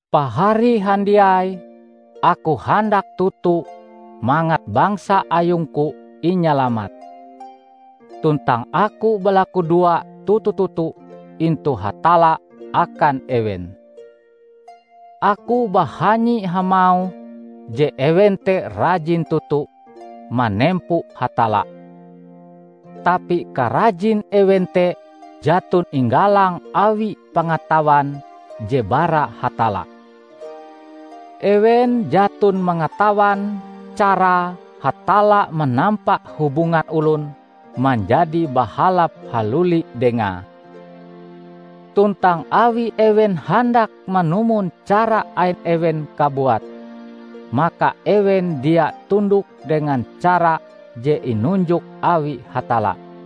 Pahari handiai! Aku handak toto mangat bangsa ayungku inyalamat. Tuntang aku balakudoa toto-toto intu Hatalla akan ewen. Aku bahanyi hamauh je ewen te rajin toto manempo Hatalla. Tapi karajin ewen te jaton inggalang awi pangatawan je bara Hatalla. Ewen jaton mangatawan carae Hatalla manampa hubungan olon manjadi bahalap haluli Dengae. Tuntang awi ewen handak manumon cara ain ewen kabuat, maka ewen dia tundok dengan cara je inunjok awi Hatalla.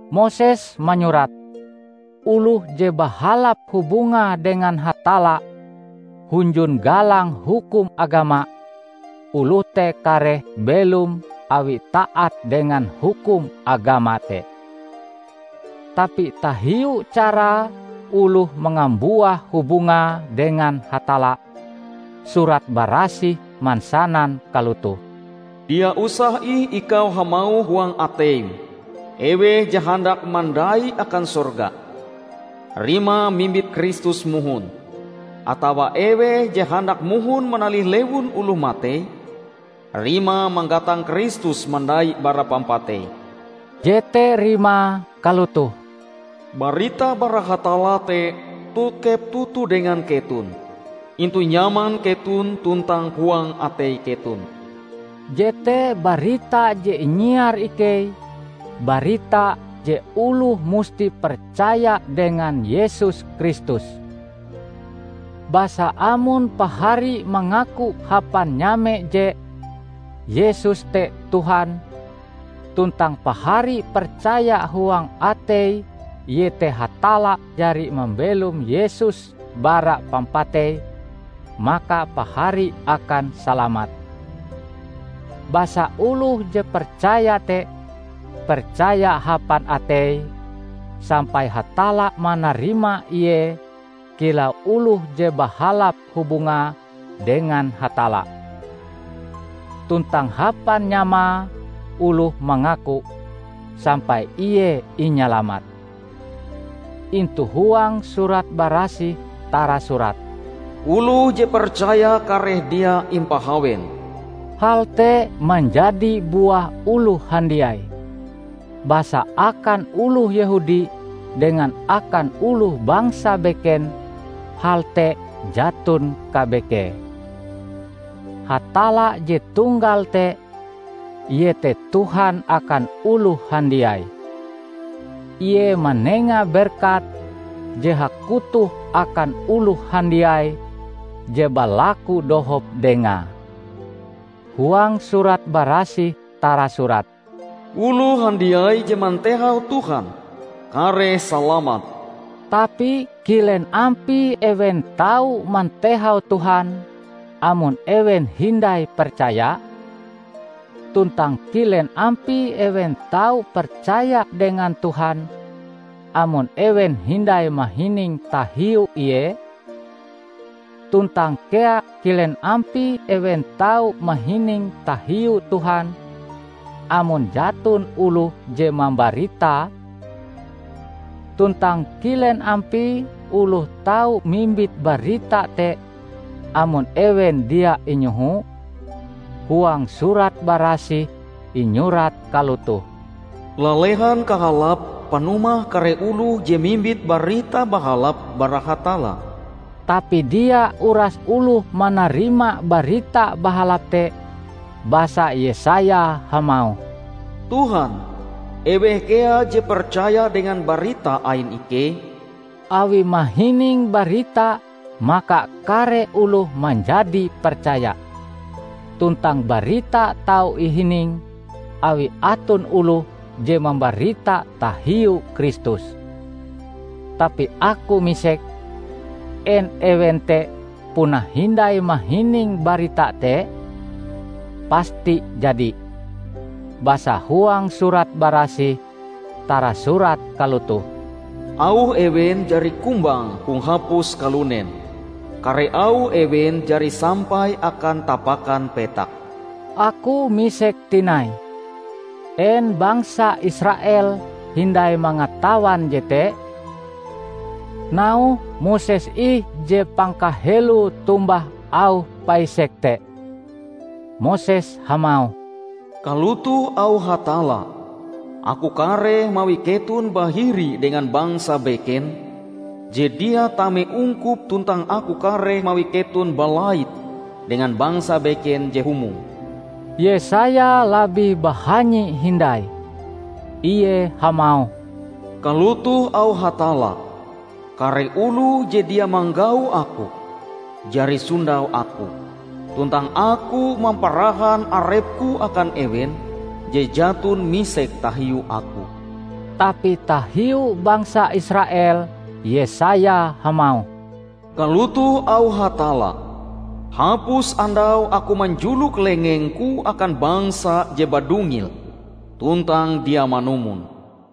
Moses manyurat, oloh je bahalap hubungae dengan Hatalla hunjun galang hukum agama, oloh te kareh belom awi taat dengan hukum agama te. Tapi tahiu carae oloh mangambuah hubungae dengan Hatalla, Surat Barasih mansanan kalotoh, "Dia usah ih ikau hamauh huang ateim, 'Eweh je handak mandai akan sorga?' (rimae mimbit Kristus mohon), atawa 'Eweh je handak mohon manalih lewun oloh matei?' (rimae manggatang Kristus mandai bara pampatei)." Jete rimae kalotoh, "Barita bara Hatalla te tokep toto dengan keton; intu nyaman keton tuntang huang atei keton." Jete barita je inyiar ikei; barita, je oloh musti percaya dengan Yesus Kristus. Basa amon pahari mangaku hapan nyame je "Yesus te Tuhan", tuntang pahari percaya huang atei iete Hatalla jari mambelom Yesus bara pampatei, maka pahari akan salamat. Basa oloh je percaya te, percaya hapan ateie, sampai Hatalla manarima ie kilau oloh je bahalap hubungae dengan Hatalla. Tuntang hapan nyamae oloh mangaku, sampai ie inyalamat. Intu huang Surat Barasih tarasurat, "Oloh je percaya kareh dia impahawen." Hal te manjadi buah oloh handiai, basa akan oloh Yehudi dengan akan oloh bangsa beken hal te jaton kabekee. Hatalla je tunggal te, ie te Tuhan akan oloh handiai. Ie manenga berkat je hakutoh akan oloh handiai je balaku dohop Dengae. Huang Surat Barasih tarasurat, "Oloh handiai je mantehau Tuhan, kareh salamat." Tapi kilen ampie ewen tau mantehau Tuhan amon ewen hindai percaya? Tuntang kilen ampie ewen tau percaya dengan Tuhan amon ewen hindai mahining tahiu Ie? Tuntang kea kilen ampie ewen tau mahining tahiu Tuhan, amon jaton oloh je mambaritae? Tuntang kilen ampie oloh tau mimbit barita te amon ewen dia inyoho? Huang Surat Barasih inyurat kalotoh, "Lalehan kahalape panumah kare oloh je mimbit Barita Bahalap bara Hatalla!" Tapi dia uras oloh manarima Barita Bahalap te. Basa Yesaya hamauh, "Tuhan, eweh kea je percaya dengan barita ain ikei?" Awi mahining barita maka kare oloh manjadi percaya, tuntang barita tau ihining, awi aton oloh je mambarita tahiu Kristus. Tapi aku misek: En ewen te puna hindai mahining barita te? Pasti jadi! Basa huang Surat Barasih tarasurat kalotoh, "Auh ewen jari kumbang hong hapus kalunen, kare auh ewen jari sampai akan tapakan petak." Aku misek tinai: En bangsa Israel hindai mangatawan jete? Nauhe Moses ih je pangkaheloe tombah auh paisek te. Moses hamauh, "Kalotoh auh Hatalla, 'Aku kareh mawi keton bahiri dengan bangsa beken je dia tame ungkup tuntang aku kareh mawi keton balait dengan bangsa beken je humong.' " Yesaya labih bahanyi hindai. Ie hamauh, "Kalotoh auh Hatalla, 'Kare oloh je dia manggau Aku, jari sondau Aku; tuntang Aku mamparahan arep-Ku akan ewen je jaton misek tahiu Aku.' " Tapi tahiu bangsa Israel Yesaya hamauh, "Kalotoh auh Hatalla, 'Hapus andau Aku manjulok lengeng-Ku akan bangsa je badungil tuntang dia manumon.' "